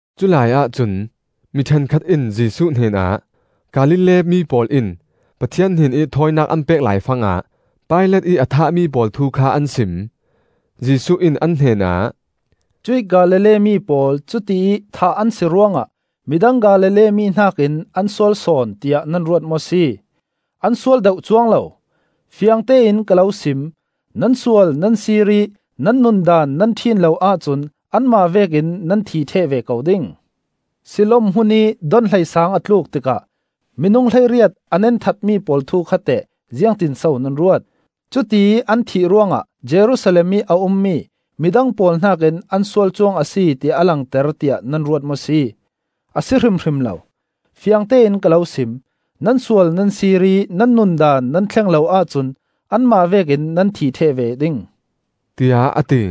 Culai ahcun mi ṭhenkhat in Jesuh hnenah, Galilee mi pawl in Pathian hnenih thawinak an pek laifangah Pilat ih a thahmi pawl thu kha an sim. Jesuh in an hnenah, “Cuih Galilee mi pawl cutiih thah an si ruangah midang Galilee mi hnakin an sual sawn, tiah nan ruat maw si? An sual deuh cuang lo! Fiangtein ka lo sim: Nan sual nan sir ih nan nun daan nan ṭhin lo ahcun anmah vekin nan thi ṭheh ve ko ding. Siloam hmunih donhleisang a tluuk tikah minung hleiriat a nenthatmi pawl thu kha teh ziangtinso nan ruat? Cutiih an thih ruangah Jerusalem ih a ummi midang pawl hnakin an sual cuang a si ti a langter tiah nan ruat maw si? A si hrimhrim lo! Fiangtein ka lo sim: Nan sual nan sir ih nan nun daan nan thleng lo ahcun anmah vekin nan thi ṭheh ve ding,” tiah a ti.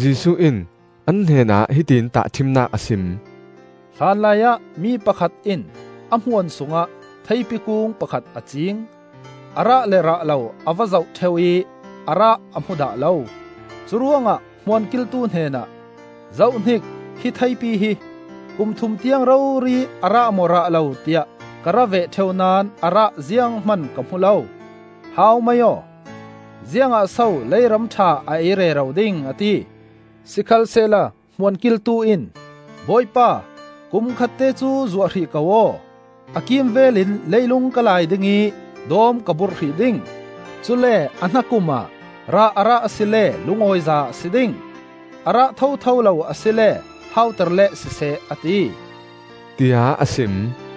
Jesuh in an hnenah hiti in tahṭhimnak a sim: “Hlanlaiah mi pakhat in a hmuan sungah theipi kung pakhat a cing. A rah le rah lo a va zoh ṭheu ih a rah a hmu dah lo. Curuangah hmuan kiltu hnenah, ‘Zohhnik, hi theipi hi! Kum thum tiang rori a rah maw rah lo, tiah ka ra veh ṭheu naón a rah zianghman ka hmu lo. Hau mai aw! Ziangah so leiram ṭha a ei rero ding?’ a ti. Sikhalsehla hmuan kiltu in ‘Bawipa, kum khatte cu zuah hrih ko aw! A kimvel in leilung ka lai ding ih dawm ka burh hrih ding. Cule a hnakum ah rah a rah asile lungawiza a si ding; a rah thotho lo asile hauter leh siseh,’ a ti,” tiah a sim.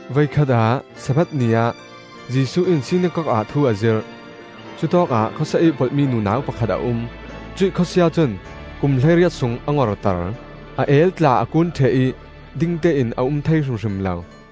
Voikhat ah Sabbath ni ah Jesuh in sinakok ah thu a zirh. Cutawkah khawsia ih polhmi nunau pakhat a um. Cuih khawsia cun kum hleiriat sung a ngorter; a el tla a kuun ṭheh ih dingtein a um thei hrimhrim lo.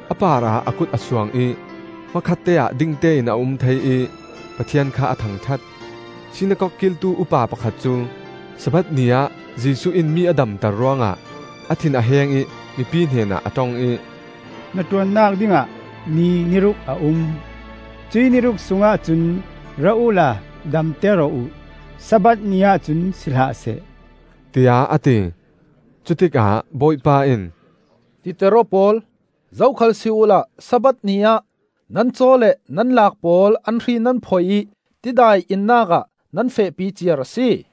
A parah a kut a suang ih hmakhatte ah dingtein a um thei ih Pathian kha a thangṭhat. Sinakok kiltu upa pakhat cu Sabbath ni ah Jesuh in mi a damter ruangah a thin a heng ih mipi hnenah a ṭong ih, “Hnaṭuannak dingah ni ni ruk a um; cuih ni ruk sungah cun ra uhla damter aw uh; Sabbath ni ahcun si hlahseh,” tiah a ti. Cutikah Bawipa in, “Titer aw pawl! Zokhal si uhla Sabbath ni ah nan caw le nan laak pawl an hri nan phoih ih tidai innak ah nan fehpi ciar a si.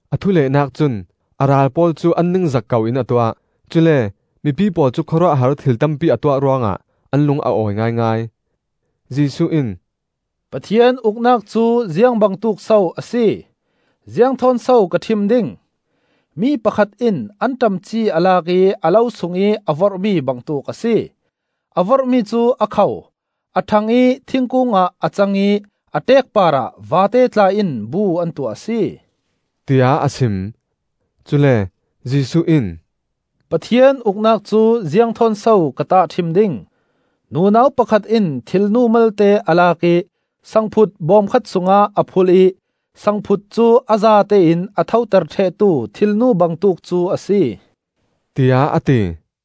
A thulehnak cun a ral pawl cu an ningzak koin a tuah; cule mipi pawl cu khawruahhar thil tampi a tuah ruangah an lung a awi ngaingai. Jesuh in, “Pathian Uknak cu ziang bangtuk so a si? Ziang thawn so ka ṭhim ding? Mi pakhat in anṭam ci a lak ih a lo sungih a vorhmi bangtuk a si. A vorhmi cu a kho, a ṭhang ih thingkung ah a cang ih a ṭeek parah vate tla in bu an tuah a si,” tiah a sim. Cule Jesuh in, “Pathian Uknak cu ziang thawn so ka tahṭhim ding? Nunau pakhat in thilnu malte a lak ih sangphut bawm khat sungah a phulh ih sangphut cu a zatein a thoter ṭhehtu thilnu bangtuk cu a si,” tiah a ti.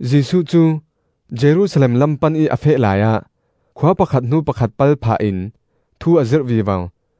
Jesuh cu Jerusalem lam pan ih a feh laiah khua pakhat hnu pakhat pal phahin thu a zirh vivo.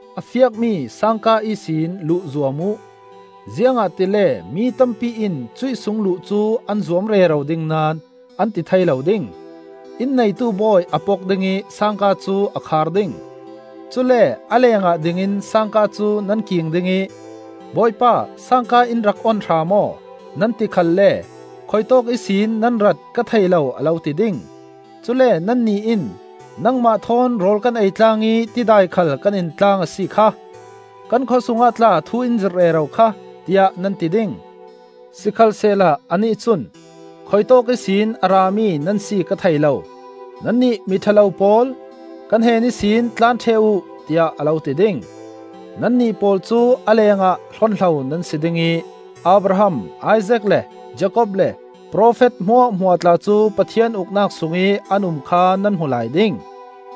“A fiakmi sangka ihsin luh zuam uh; ziangahtile mi tampi in cuih sung luh cu an zuam rero ding naón an ti thei lo ding. Inn neitu bawi a pok ding ih sangka cu a khar ding; cule a lengah dingin sangka cu nan king ding ih ‘Bawipa, sangka in rak on hram aw,’ nan ti khalle ‘Khuitawk ihsin nan rat ka thei lo,’ a lo ti ding. Cule nannih in, ‘Nangmah thawn rawl kan ei tlang ih tidai khal kan in tlang a si kha! Kan khawsungah tla thu in zirh rero kha!’ tiah nan ti ding. Sikhalsehla anih cun ‘Khuitawk ihsin a rami nan si ka thei lo. Nannih miṭha lo pawl, ka hnen ihsin tlan ṭheh uh,’ tiah a lo ti ding. Nannih pawl cu a lengah hlonhlo nan si ding ih Abraham, Isaak le Jakob le profet hmuahhmuah tla cu Pathian Uknak sungih an um kha nan hmu lai ding;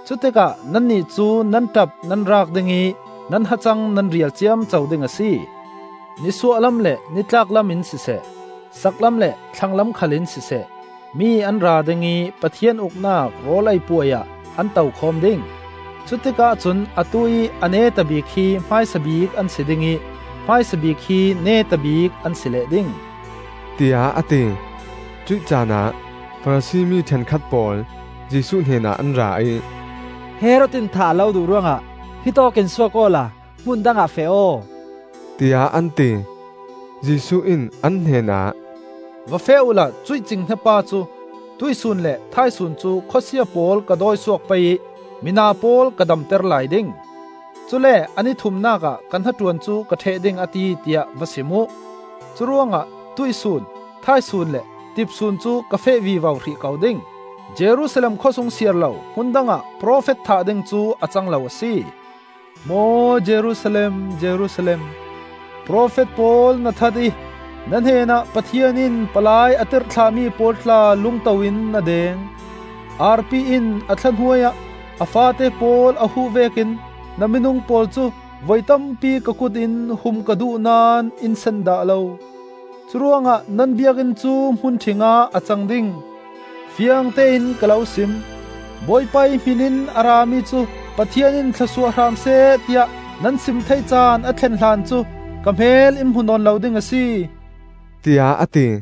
cutikah nannih cu nan ṭap nan raak ding ih nan hacang nan rial ciamco ding a si. Nisuahlam le nitlaklam in siseh, saklam le thlanglam khal in siseh, mi an ra ding ih Pathian Uknak rawl ei puai ah an tokhawm ding. Cutikah cun atu-ih a neta bik hi hmaisa bik an si ding ih hmaisa bik hi neta bik an si leh ding,” tiah a ti. Cuih caanah Farasi mi ṭhenkhat pawl Jesuh hnenah an ra ih, “Herod in thah a lo duh ruangah hitawk in suak awla hmun dangah feh aw,” tiah an ti. Jesuh in an hnenah, “Va feh uhla cuih cinghnia pa cu ‘Tuihsun le thaisun cu khawsia pawl ka dawisuak pei ih mina pawl ka damter lai ding. Cule a ni thumnak ah ka hnaṭuan cu ka ṭheh ding a ti,’ tiah va sim uh. Curuangah tuihsun, thaisun le tipsun cu ka feh vivo hrih ko ding. Jerusalem khawsung siar lo hmun dangah profet thah ding cu a cang lo a si. “Maw Jerusalem, Jerusalem! Profet pawl na that ih na hnenah Pathian in palai a tirhthlahmi pawl tla lungto in na deng. Arpi in a thla hnuai ah a faate pawl a huh vekin na minung pawl cu voi tampi ka kut in hum ka duh naón in sen dah lo! Curuangah nan Biakinn cu hmun ṭhing ah a cang ding. Fiangtein ka lo sim: ‘Bawipa ih hminin a rami cu Pathian in thlawsuah hram seh,’ tiah nan sim thei caan a thlen hlan cu ka hmel in hmu nawn lo ding a si,” tiah a ti.